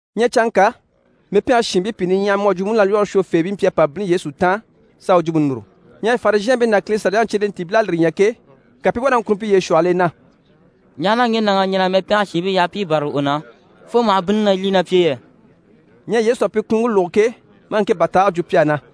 Ɲyɛ canŋka, mɛpɛngɛ shiinbii pìi niɲyahamii mu à jwo múnalwɔɔre shwofeebii mpyi a pa bínni Yesu taan s'a u jwumpe núru. Ɲyɛ Farizhɛɛnbii ná Kile Saliyaŋi cyelentiibil'à lire ɲya ke, ka pi i wá na ŋkunni piye shwɔhɔl'e na: «Ɲaha na ŋge nàŋ'à ɲɛn'a mɛpɛngɛ shiinbii yaha pi i bârali u na, fo maha bínnini na lyî ná pi e yɛ?» Ɲyɛ Yesu à pi kunuŋke lógo ke, maa ŋke bàtaage jwo pi á na: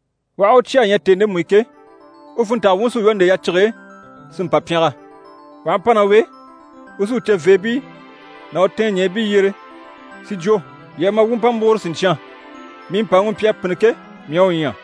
U aha u cya a ɲya tèni ndemu i ke, u funntanga wuŋi sí u lwɔ́ nde yacige e, si mpa pyɛngɛ. U aha mpa ná u e, u sí u ceveebii ná u tɛɛnɲɛɛbii yyere si jwo “Yii a ma, wuu u mpa múguro siɲcyan. Mii mpàŋi u mpyi a pînni ke, mii à u ɲya.”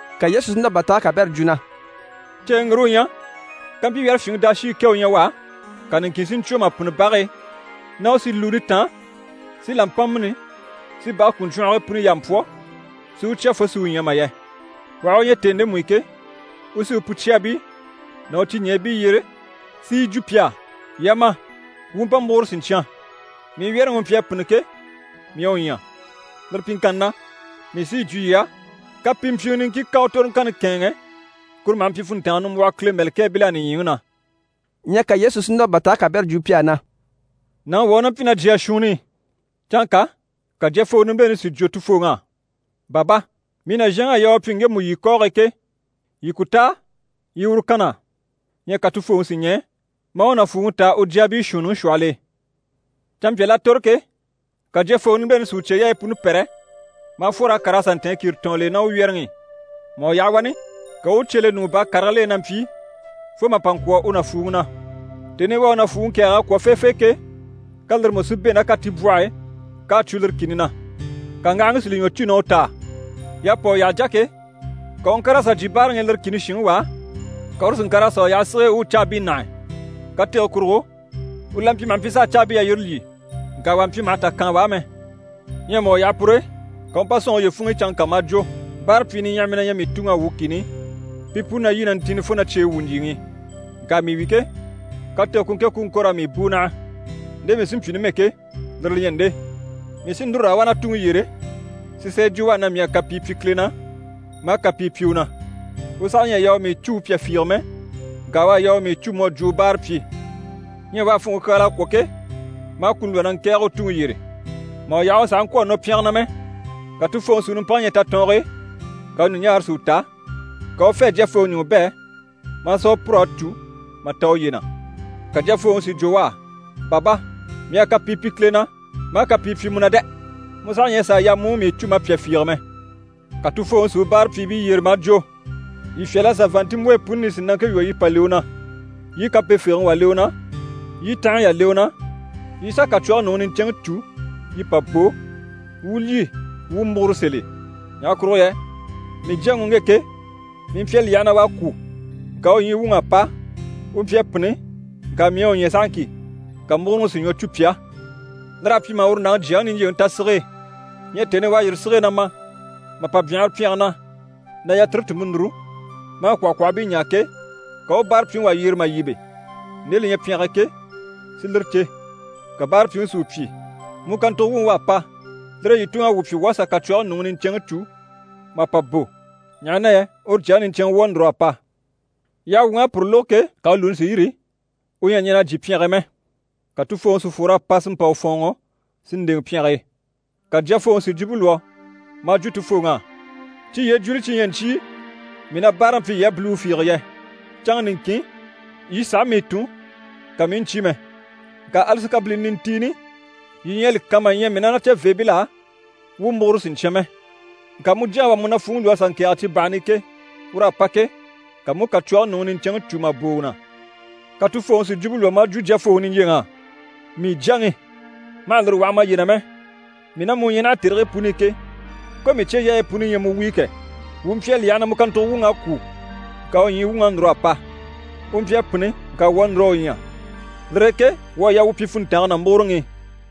Ka Yesu si núr'a bàtaage kabɛrɛ jwo na: «Ceeŋi ŋgire u ɲyɛ, kampyi wyɛ́rɛfyinŋi daashii kɛ u ɲyɛ u á, ka niŋkin si ɲcwo mà pînni bage e, na u sì lùuni táan si làmpa mîni si bage kùruɲcwɔngii puni yaa mpwɔ́, si u cya fo si u ɲya mà yɛ? U aha u ɲya tèni ndemu i ke, u sí u pucyaabii ná u ciɲɛɛbii yyere si yi jwo pi á “Yii a ma, wuu u mpa múguro siɲcyan. Mii wyɛ́rɛŋi u mpyi a pînni ke, mii à u ɲya.” Lire pyiŋkanni na, mii sí yi jwo yii á, kapimpyiŋɛ niŋkin ká u toroŋkanni kɛ̂ɛnŋɛ, kuru maha mpyi funntanga nimbwɔhɔ Kile mɛ̀lɛkɛɛbil'á nìɲyiŋi na.» Ɲyɛ ka Yesu sí núr'a bàtaage kabɛrɛ jwo pi á na: «Nàŋi wà u ná mpyi ná jyaa shuunni i. Canŋka ka jyafooŋi nimbileni si jwo tufooŋ'á “Baba, mii nàzhanŋ'à yaa u pyi ŋgemu yii kɔɔge ke, yii ku táa yii i uru kan na á!” Ɲyɛ ka tufooŋi si ɲɛɛ, maa u nàfuuŋi táa u jyaabii shuunniŋi shwɔhɔl'e. Canmpyal'à tòro ke, ka jyafooŋi nimbileni si u cyeyaayi puni pɛ́rɛ, maa fwor'a kàr'a sà ntɛ̀ɛn kìritɔɔnni l'e ná u wyɛ́rɛŋi i. Mà u yaha wani, ka u u cye le ɲùŋɔ baa karigil'e na mpyi, fo mà pa ŋkwɔ̀ u nàfuuŋi na. Tèni i u à u nàfuuŋi kɛ̀ɛg'a kwɔ̀ feefee ke, ka lire mú si bɛ̂ ná katibwɔh'e k'à cwo lire kìni na. Ka ŋgahaŋi si li ɲwɔ cû na u taa. Y'à pa u yyaha jà ke, ka u u ŋkàr'a sà jyè báaraŋi i lire kìni shinŋi wà á, ka uru si ŋkàr'a sà u yaha sige e, u u caabii nâhe. Katege kurugo, u la mpyi maha mpyi s'a caabii yalyire lyî. Ŋka wà mpyi maha tà kaan u á mɛ. Ɲyɛ mà u yaha pur'e, ka u u mpa sɔ̂nŋɔ uye funŋ'i canŋka maa jwo “Báarapyii niɲyahamii na ɲyɛ mii tuŋ'á wuu kìni i, pi puni na lyî na ntìnni fo na cyeyi wwû ɲjyìŋi i. Ŋka mii wi ke, katege ku ŋke ku u ŋko raa mii bùu naha. Nde mii sí n‑pyi numɛ ke, lire li ɲyɛ nde: mii sí núru raa wá na tuŋi yyére, sí sà yi jwo u á na mii à kapii pyi Kile na, maa kapii pyi u na. U saha ɲyɛ a yaa u mii cû u pyà fiige mɛ, ŋka u à yaa u mii cû mu à jwo u báarapyi.” Ɲyɛ u à funŋke kyaala a kwɔ̀ ke, maa kuni lwɔ́ na ŋkɛ̀ɛge u tuŋi yyére. Mà u yaha u sàha ŋkwɔ̀ a nɔ pyɛnge na mɛ, ka tufooŋi si u nimpaŋi ɲya tatɔɔnge e, ka u ɲùɲaare si u ta, ka u u fê a jyafooŋi ɲùŋɔ bɛ̂, maa sà u pûr'a cû mà ta uye na. Ka jyafooŋi si jwo u á “Baba, mii à kapii pyi Kile na, maa kapii pyi mu na dɛ! Mu saha ɲyɛ a sàa yaa mu u mii cû ma pyà fiige mɛ.” Ka tufooŋi si u báarapyiibii yyere maa jwo “Yii fyâl'a sà vàanntinmbwoyi puni nisinaŋke lwɔ́ yii pa le u na, yii i kampefegeŋi wà le u na, yii i tanhaɲyi yà le u na, yii i sà kàcwɔge nùŋi niɲcɛnŋi cû, yii pa bò, wuu u lyî wuu u múguro sèl'e. Ɲaha kurugo yɛ mii jyaŋi u ŋge ke, mii mpyi a li yaha na u à kwû, ŋka u ɲyii wuŋ'à pa, u mpyi a pînni, ŋka mii à u ɲya sahaŋki.” Ka múguroŋi si ɲwɔ cû pi á. Lir'à pyi mà uru nàŋi jyaŋi niɲjyeŋi ta sige e. Ɲyɛ tèni i u à yîri sige e na ma mà pa byanhara pyɛnge na, na yatire tùnmpe núru, maa kwɔ̀hɔkwɔhɔbii ɲaa ke, ka u u báarapyiŋi wà yyere mà yíbe, nde li ɲyɛ pyɛnge e ke, si lire cè. Ka báarapyiŋi si u pyi “Mu kàntugo wuŋi u à pa, lire e yii tuŋ'à wuu pyi wuu à sà kàcwɔge nùŋi niɲcɛnŋi cû mà pa bò, ɲaha na yɛ uru jyaŋi niɲcɛnŋɛ wu à núr'a pa.” Yyaha wuŋ'à puru lógo ke, ka u lùuni si yîri, u ɲyɛ a ɲɛn'a jyè pyɛnge e mɛ. Ka tufooŋi si fwor'a pa si mpa u fɔ̀ɔnŋɔ si ndèŋɛ pyɛnge e. Ka jyafooŋi si jwumpe lwɔ́ maa jwo tufooŋ'á “Cyi yyee jùuli cyi ɲyɛ ɲcyii mii na báaraŋi pyi yii á biliwe fiige yɛ? Canŋa niŋkin, yii sàha mii tun, ka mii i ɲcyé mɛ. Ŋka ali sikabilini nintiini yii ɲyɛ a li kan mà ɲya mii ná na ceveebil'á wuu u múguro siɲcyan mɛ. Ŋka mu jyaŋi u à mu nàfuuŋi lwɔ́ a sà ŋkɛ̀ɛge cibahani i ke, ur'à pa ke, ka mu u kàcwɔge nùŋi niɲcɛnŋi cû mà bò u na.” Ka tufooŋi si jwumpe lwɔ́ maa jwo jyafooŋi niɲjyeŋ'á “Mii jyaŋi, ma hà lire waha maye na mɛ, mii ná mu u ɲyɛ naha tèrigii puni i ke, ko mii cyeyaayi puni ɲyɛ mu wuyo kɛ! Wuu mpyi a li yaha na mu kàntugo wuŋ'à kwû, ŋka u ɲyii wuŋ'à núr'a pa. U mpyi a pînni ŋka wuu à núr'a u ɲya. Lire e ke wuu à yaa wuu pyi funntange ná múguroŋi i.”»